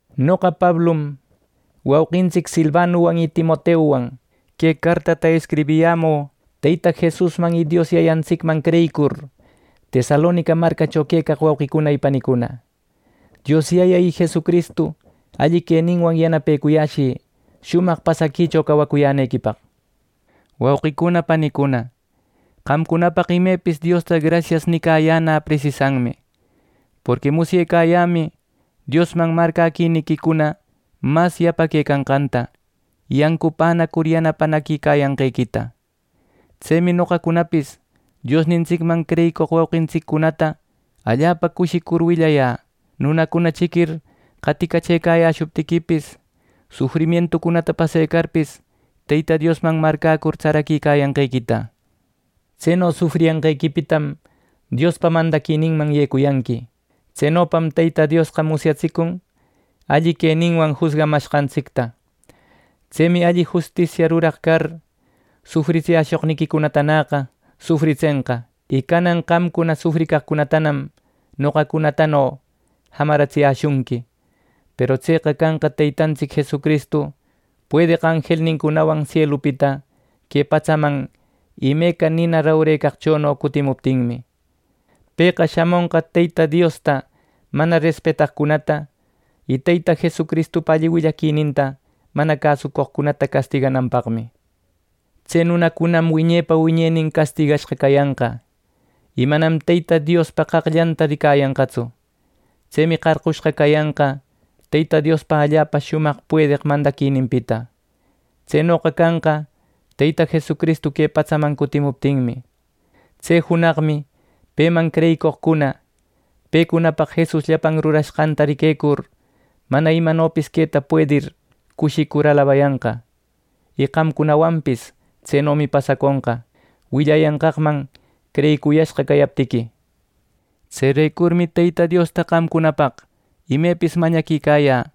Noqa Pablum, wauqintsic Silvanuwan y Timoteuwan, que cartata escribiyämü Teyta Jesusman y Dios Yayantsicman creyicur, Tesalonica marcacho quecaq wauqicuna y panicuna. Dios Yaya y Jesucristu alli queninwan yanapecuyäshï shumaq pasaquicho cawacuyänequipaq. Wauqicuna panicuna, qamcunapaq imepis Diosta grasias nicayäna presisanmi. Porqui musyecayämi Diosman marcäquiniquicuna mas yapaquecanqanta, y ancupänacur yanapanaquicayanqequita. Tsemi noqacunapis Diosnintsicman creyicoq wauqintsiccunata allapa cushicur willayä, nunacuna chiquir qaticachëcayäshuptiquipis, sufrimientucunata pasecarpis, Teyta Diosman marcäcur tsaraquicayanqequita. Tseno sufriyanqequipitam Diospa mandaquininman yecuyanqui. Tsenopam Teyta Diosqa musyatsicun alli queninwan jusgamanqantsicta. Tsemi alli justisiata ruraq car, sufritsiyäshoqniquicunatanäqa sufritsenqa. Y canan qamcuna sufricaqcunatanam noqacunatano jamaratsiyäshunqui; peru tseqa canqa Teytantsic Jesucristu puedeq anjelnincunawan sielupita que patsaman imeca nina rupecaqchono cutimuptinmi. Pëqa shamonqa Teyta Diosta mana respetaqcunata, y Teyta Jesucristupa alli willaquininta mana cäsucoqcunata castigananpaqmi. Tse nunacunam wiñepa wiñenin castigashqa cayanqa, y manam Teyta Diospa qaqllanta ricayanqatsu. Tsemi qarqushqa cayanqa Teyta Diospa allapa shumaq puedeq mandaquininpita. Tsenoqa canqa Teyta Jesucristu que patsaman cutimuptinmi. Tse junaqmi peman creyicoqcuna pecunapaq Jesus llapan rurashqanta riquecur mana imanopis queta puedir cushicur alabayanqa. Y qamcunawanpis tsenomi pasaconqa, willayanqaqman creyicuyashqa cayaptiqui. Tserecurmi Teyta Diosta qamcunapaq imepis mañaquicayä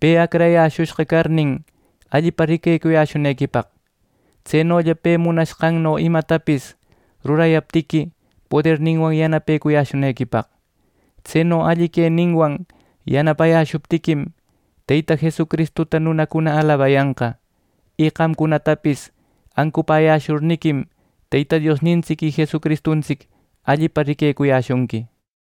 pe acrayäshushqa carnin, allipa riquecuyäshunequipaq. Tsenolla pe munashqanno imatapis rurayaptiqui poderninwan yanapecuyäshunequipaq. Tseno alli queninwan yanapayäshuptiquim, Teyta Jesucristuta nunacuna alabayanqa; y qamcunatapis ancupäyäshurniquim, Teyta Diosnintsic y Jesucristuntsic allipa riquecuyäshunqui.